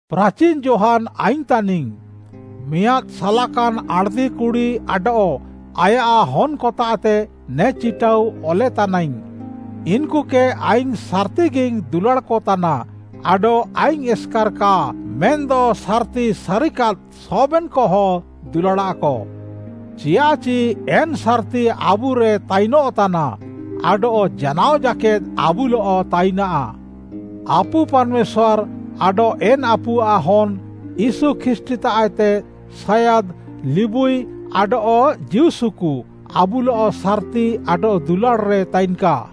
ପ୍ରାଚିନ୍‌ ଯୋହାନ୍‌ ଆଇଙ୍ଗ୍‌ ତାନିଙ୍ଗ୍‌, ମିଆଁଦ୍‌ ସାଲାକାନ୍‌ ଆଣ୍‌ଦି କୁଡ଼ି ଆଡଃ ଆୟାଃ ହନ୍‌କତାଃତେ ନେ ଚିଟାଉ ଅଲେତାନାଇଙ୍ଗ୍‌। ଇନ୍‌କୁକେ ଆଇଙ୍ଗ୍‌ ସାର୍‌ତିଗିଙ୍ଗ୍‌ ଦୁଲାଡ଼୍‌କ ତାନା, ଆଡଃ ଆଇଙ୍ଗ୍‌ ଏସ୍‌କାର୍‌ କା, ମେନ୍‌ଦ ସାର୍‌ତି ସାରିକାଦ୍‌ ସବେନ୍‌କହଁ ଦୁଲାଡ଼ାଃକ। ଚିୟାଃଚି ଏନ୍‌ ସାର୍‌ତି ଆବୁରେ ତାଇନଃତାନା ଆଡଃ ଜାନାଅ ଜାକେଦ୍‌ ଆବୁଲଃ ତାଇନାଃ। ଆପୁ ପାର୍‌ମେଶ୍ୱାର୍‌ ଆଡଃ ଏନ୍‌ ଆପୁଆଃ ହନ୍‌ ୟୀଶୁ ଖ୍ରୀଷ୍ଟ୍‌ତାଃଏତେ ସାୟାଦ୍‌, ଲିବୁଇ ଆଡଃ ଜୀଉସୁକୁ ଆବୁଲଃ ସାର୍‌ତି ଆଡଃ ଦୁଲାଡ଼୍‌ରେ ତାଇନ୍‌କା।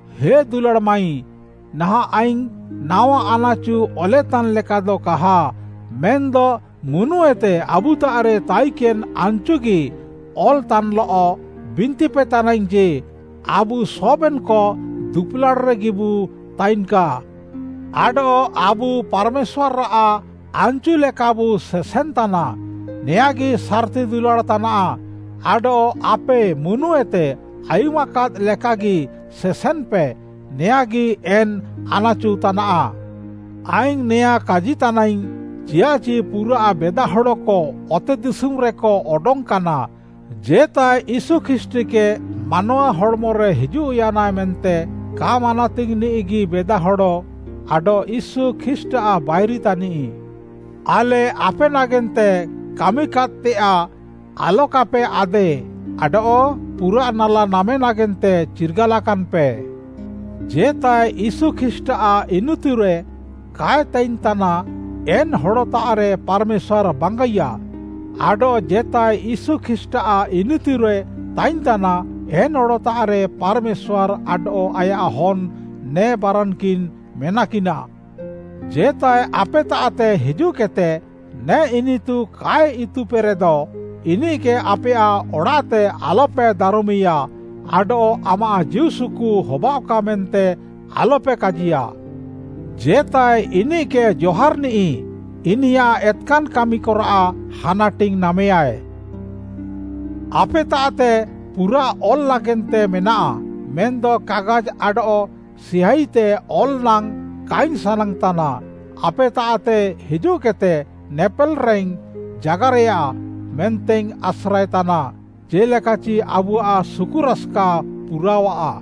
ହେ ଦୁଲାଡ଼୍‌ ମାଈ, ନାହାଁଃ ଆଇଙ୍ଗ୍‌ ନାୱା ଆନ୍‌ଚୁ ଅଲେତାନ୍‌ ଲେକାଦ କାହା ମେନ୍‌ଦ ମୁନୁଏତେ ଆବୁତାଃରେ ତାଇକେନ୍‌ ଆନ୍‌ଚୁକେଗି ଅଲ୍‌ତାନ୍‌ଲଃ ବିନ୍ତିପେତାନାଇଙ୍ଗ୍‌ ଯେ, ଆବୁ ସବେନ୍‌କ ଦୁପୁଲାଡ଼୍‌ରେଗିବୁ ତାଇନ୍‌କା। ଆଡଃ ଆବୁ ପାର୍‌ମେଶ୍ୱାର୍‌ଆଃ ଆନ୍‌ଚୁଲେକାବୁ ସେସେନ୍‌ତାନା, ନେଆଁଁଗି ସାର୍‌ତି ଦୁଲାଡ଼୍‌ ତାନାଃ। ଆଡଃ ଆପେ ମୁନୁଏତେ ଆୟୁମାକାଦ୍‌ ଲେକାଗି ସେସେନ୍‌ପେ, ନେଆଁଁଗି ଏନ୍‌ ଆନାଚୁ ତାନାଃ। ଆଇଙ୍ଗ୍‌ ନେଆଁ କାଜିତାନାଇଙ୍ଗ୍‌ ଚିଆଃଚି ପୁରାଃ ବେଦାହଡ଼କ ଅତେଦିଶୁମ୍‌ରେକ ଅଡଙ୍ଗ୍‌କାନା। ଜେତାଏ ୟୀଶୁ ଖ୍ରୀଷ୍ଟ୍‌କେ ମାନୱା ହଡ଼୍‌ମରେ ହିଜୁଃୟାନା ମେନ୍ତେ କା ମାନାତିଙ୍ଗ୍‌ନିଃଗି ବେଦାହଡ଼ ଆଡଃ ୟୀଶୁ ଖ୍ରୀଷ୍ଟ୍‌ଆଃ ବାଇରି ତାନିଃ। ଆଲେ ଆପେ ନାଗେନ୍ତେ କାମିକାଦ୍‌ତେୟାଃ ଆଲକାପେ ଆଦେ ଆଡଃ ପୁରା ନାଲା ନାମେ ନାଗେନ୍ତେ ଚିର୍ଗାଲାକାନ୍‌ପେ। ଜେତାଏ ୟୀଶୁ ଖ୍ରୀଷ୍ଟ୍‌ଆଃ ଇନିତୁରେ କାଏ ତାଇନ୍‌ତାନା, ଏନ୍‌ ହଡ଼ତାଃରେ ପାର୍‌ମେଶ୍ୱାର୍‌ ବାଙ୍ଗାଇୟା। ଆଡଃ ଜେତାଏ ୟୀଶୁ ଖ୍ରୀଷ୍ଟ୍‌ଆଃ ଇନିତୁରେ ତାଇନ୍‌ତାନା, ଏନ୍‌ ହଡ଼ତାଃରେ ପାର୍‌ମେଶ୍ୱାର୍‌ ଆଡଃ ଆୟାଃ ହନ୍‌, ନେ ବାରାନ୍‌କିନ୍‌ ମେନାକିନା। ଜେତାଏ ଆପେତାଃତେ ହିଜୁଃକେଦ୍‌ତେ ନେ ଇନିତୁ କାଏ ଇତୁପେରେଦ, ଇନିଃକେ ଆପେୟାଃ ଅଡ଼ାଃତେ ଆଲ୍‌ପେ ଦାରମ୍‌ମିୟା ଆଡଃ “ଆମାଃ ଜୀଉସୁକୁ ହବାଅଃକା” ମେନ୍ତେ ଆଲ୍‌ପେ କାଜିୟା। ଜେତାଏ ଇନିଃକେ ଜହାରିନିଃ, ଇନିୟାଃ ଏତ୍‌କାନ୍‌ କାମିକରାଃ ହାନାଟିଙ୍ଗ୍‌ ନାମେୟାଏ। ଆପେତାଃତେ ପୁରାଃ ଅଲ୍‌ ନାଗେନ୍ତେ ମେନାଃ, ମେନ୍‌ଦ କାଗାଜ୍‌ ଆଡଃ ସିହାଇତେ ଅଲ୍‌ ନାଙ୍ଗ୍‌ କାଇଙ୍ଗ୍‌ ସାନାଙ୍ଗ୍‌ତାନା। ଆପେତାଃତେ ହିଜୁଃକେଦ୍‌ତେ ନେପେଲ୍‌ରେଇଙ୍ଗ୍‌ ଜାଗାରେୟା ମେନ୍ତେଇଙ୍ଗ୍‌ ଆସ୍ରାଏ ତାନା, ଜେ'ଲେକାଚି ଆବୁଆଃ ସୁକୁରାସ୍‌କା ପୁରାଅଃଆ।